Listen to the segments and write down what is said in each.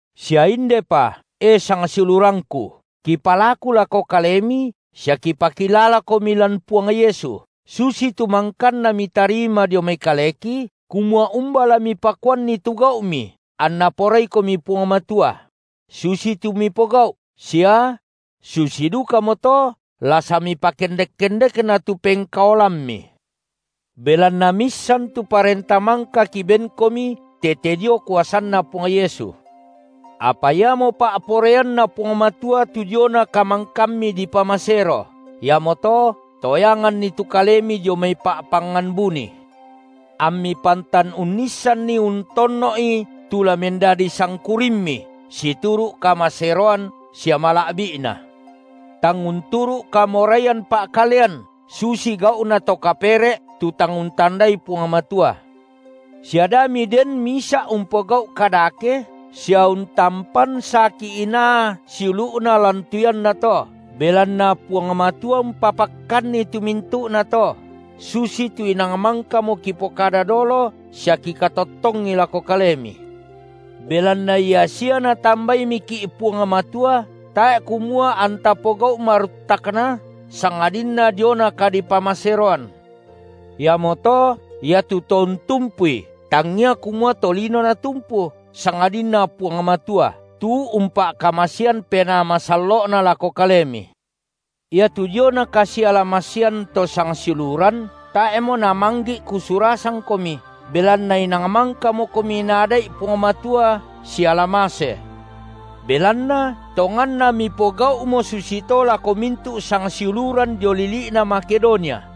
Sia indepa, e sangsiulurangku, kipalaku lako kalemi sia kipakilalakomi lan Puang Yesu, susitu mangkanna mitarima dio mai kaleki, kumua umba la mipakuanni tu gau’mi anNa poraikomi Puang Matua, – susitu mipogau’ sia –, susi dukamoto la samipakendek-kendekna tu pengkaolammi. Belanna miissan tu parenta mangka kibenkomi tete dio kuasanNa Puang Yesu. Apa iamo pa’poraianNa Puang Matua tu diona kamangkammi dipamasero, iamoto toyanganni tu kalemi dio mai pa’pangngan buni, ammi pantan unnissanni untonno’i tu la mendadi sangkurimmi situru’ kamaseroan sia mala’bi’na, tang unturu’ kamoraian pa’kalean, susi gau’na to kapere’ tu tang untandai Puang Matua; sia da miden misa’ umpogau’ kadake sia untampan saki inaa siulu’na lan tu iannato, belanna Puang Matua umpapakkanni tu mintu’nato, susitu inang mangkamo kipokada dolo sia kikatottongi lako kalemi. Belanna ia sia Natambaimiki’ Puang Matua tae’ kumua anta pogau’ maruttakna sangadinna diona kadipamaseroan. Iamoto, iatu to untumpui, tangia kumua tolino natumpu, sangadinna Puang Matua, tu umpa’kamasean Penaa Masallo’Na lako kalemi. Iatu diona kasiala-masean to sangsiuluran, tae’mo namanggi’ kusurasangkomi, belanna inang mangkamokomi Naada’i Puang Matua sialamase. Belanna tonganna mipogau’mo susito lako mintu’ sangsiuluran dio lili’na Makedonia.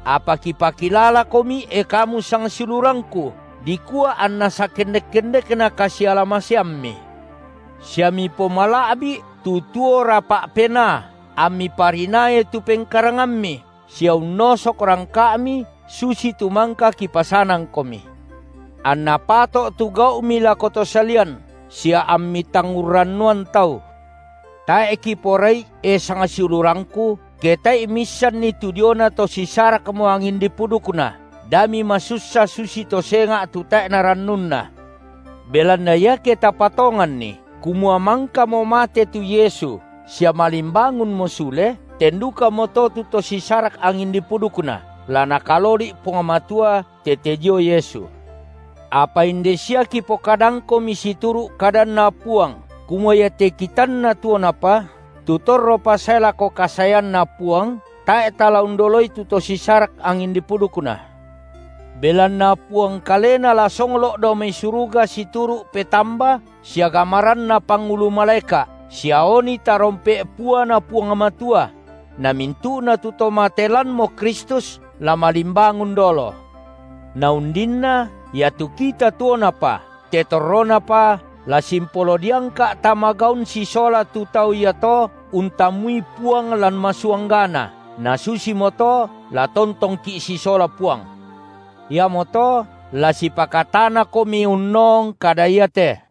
Apa kipakilalakomi, e kamu sangsiulurangku, dikua anna sakendek-kendekna kasiala- maseammi. Sia mipomala’bi’ tu tuo rapa’ penaa, ammi parinaai tu pengkarangammi, sia unnosok rangka’mi, susitu mangka kipasanangkomi; anna pato’ tu gau’mi lako to salian, sia ammi tang urrannuan tau. Tae’ kiporai, e sangsiulurangku, ke tae’i miissanni tu diona tu to sisarakmo angin dipudukna, da mimasussa susito senga’ tu tae’na rannunna. Belanna iake tapatonganni kumua mangkamo mate tu Yesu sia malimbangunmo sule, ten dukamoto tu to si sarak angin dipudukna la Nakaloli’ Puang Matua tete dio Yesu. Apa inde sia kipokadangkomi situru’ kadanNa Puang, kumua iate kitanna tuonapa, tu torropa sae lako kasaeanNa Puang, tae’ tala undoloi tu to sisarak angin dipudukna. Belanna Puang kalena la songlo’ dao mai suruga situru’ petamba sia gamaranna pangulu malaeka’ sia oni tarompe’ puaNa Puang Matua; na mintu’na tu to mate lanmo Kristus la malimbangun dolo; na undinna iatu kita tuonapa, te torronapa, la simpolo diangka’ tama gaun sisola tu tau iato untammui Puang lan masuanggana, na susimoto la tontongki’ sisola Puang. Iamoto la sipakatanakomi unnoong kada iate.